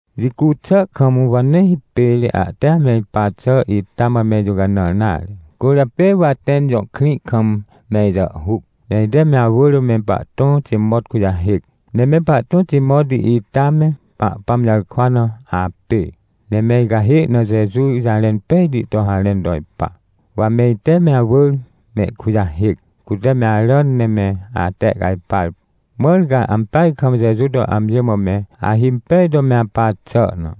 Jicu xà kam, wa nee hipêr ahte ame ipa xà ita mã me ijũcanãr nare. Cwỳrjapê wa Atẽn jõ krĩ kam me ijàhhuc. Ne ite me awỳr me pahtõ Timot kujahêc. Ne me pahtõ Timot ita me Pahpãm jarkwa na apê, ne me icahê na Jeju jarẽn pejti to harẽn to ipa. Wa me ite me awỳr mehkujahêc, cute me aràn ne me atehcajpar, mãr ca ampeaj kam Jeju to amji mã me ahimpej to me apa xà na.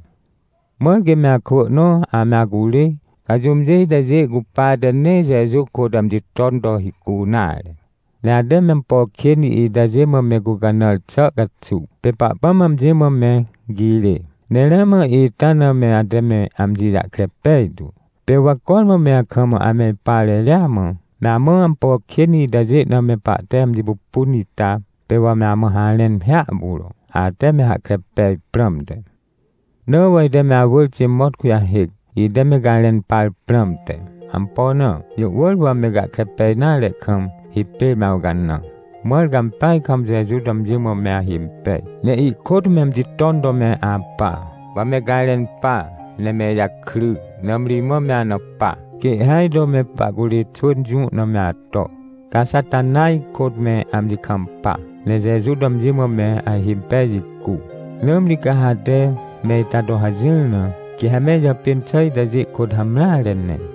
Mãr quê me akwỳ nõ ame acurê, ca jũmjê itajê cupate nee Jeju kôt amji ton to hicu nare. Ne ate me ampo kên itajê mã me gũcanãr xà caxuw, pê Pahpãm amji mã me girê. Ne ramã ita na me ate me amji jahkre pejtu. Pê wa cormã me akam ame ipa reria mã, me amã ampo kên itajê na me pahte amji pupun ita, pê wa me amã harẽn hiahpuro, ate me hahkre pej prãmte. Na wa ite me awỳr Timot kujahêc, ite me garẽn par prãmte. Ampo na? Jũ wỳr wa me gahkre pej nare kam, hipêr me awcanã. Mãr ca ampeaj kam Jeju to amji mã me ahimpej, ne ihkôt me amji ton to me apa, wa me garẽn pa, ne me ijakry. Nãmri imã me ana pa, quê ihhêaj to me pahcurê xwỳn jũ na me ato, ca Xatanaj kôt me amji kampa, ne Jeju to amji mã me ahimpej jicu. Nãmri ca ha ate me ita to hajỹr na, quê ha me ijàpên xà itajê kôt hamreare ne.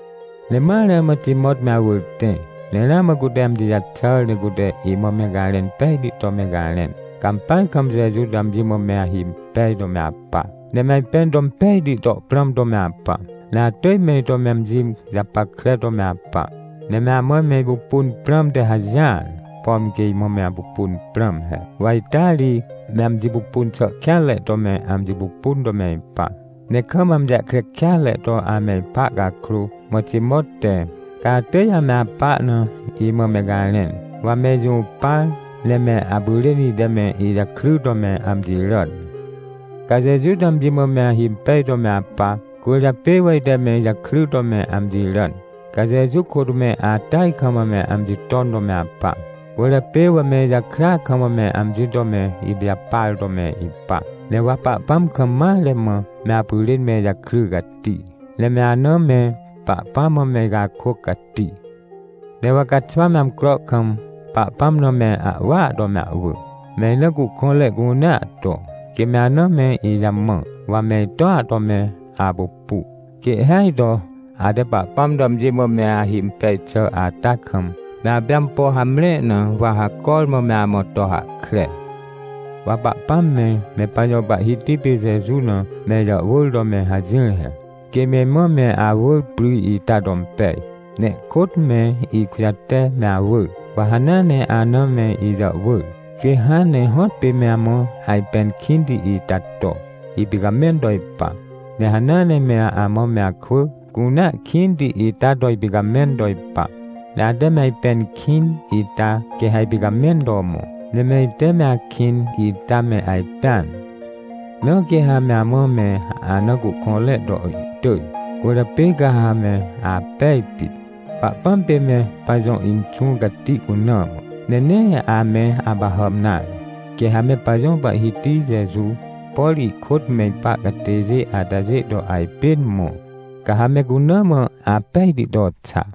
Ne ma ramã Timot me awỳr tẽ, ne ramã cute amji jaxàr ne cute imã me garẽn pejti to me garẽn. Ca ampeaj kam Jeju to amji mã me ahimpej to me apa, ne me ajpẽn to impejti to prãm to me apa. Ne atỳj me ito me amji japackre to me apa, ne me amã me ipupun prãmte hajỹar, pom quê imã me apupun prãm he. Wa ita ri me amji pupun xà kêanre to me amji pupun to me ipa, ne kam amji jahkre kêatre to ame ipa cakrô, mã Timot te, ca atỳj ame apa na, imã me garẽn. Wa me ijũpar, ne me apyrên ite me ijakry to me amji ràn. Ca Jeju to amji mã me ahimpej to me apa, cwỳrjapê wa ite me ijakry to me amji ràn. Ca Jeju kôt me atỳaj kam me amji ton to me apa, cwỳrjapê wa me ijakrya kam me amji to me ipijapar to me ipa. Ne wa Pahpãm kam mare mã me apyrên me ijakry cati, ne me ana me Pahpãm mã me icakôc cati. Ne wa caxwa me amcro kam, Pahpãm na me ahwỳa to me ahwỳ, me ina cuhkõnre cunea to, quê me ana me ijamã, wa me itoa to me apupu. Quê ihhêaj to ate Pahpãm to amji mã me ahimpej xà ata kam, me apê ampo hamre na, wa ha cormã me amã to hahkre. Wa Pahpãm me, me pajõ Pahhiti pê Jeju na me ijàhwỳr to me hajỹr he, quê me imã me awỳr pry ita to impej, ne ihkôt me ikujate me awỳr. Wa hanea ne ahna me ijàhwỳr, quê hãn ne hõtpê me amã ajpẽn kĩnti ita to ipicamẽn to ipa. Ne hanea ne me amã me akwỳ cunea kĩnti ita to ipicamẽn to ipa. Ne ate me ajpẽn kĩn ita, quê ha ipicamẽn to mõ, ne me ite me akĩn ita me ajpẽan. Na quê ha me amã me ana cuhkõnre to ihtỳj. Cwỳrjapê ca ha me apej pit, Pahpãm pê me pajõ Inxũ Cati cuna mã, ne nee ame apahàm nare. Quê ha me pajõ Pahhiti Jeju, por ihkôt me ipa catêjê atajê to ajpên mõ, ca ha me cuna mã apejti to xa.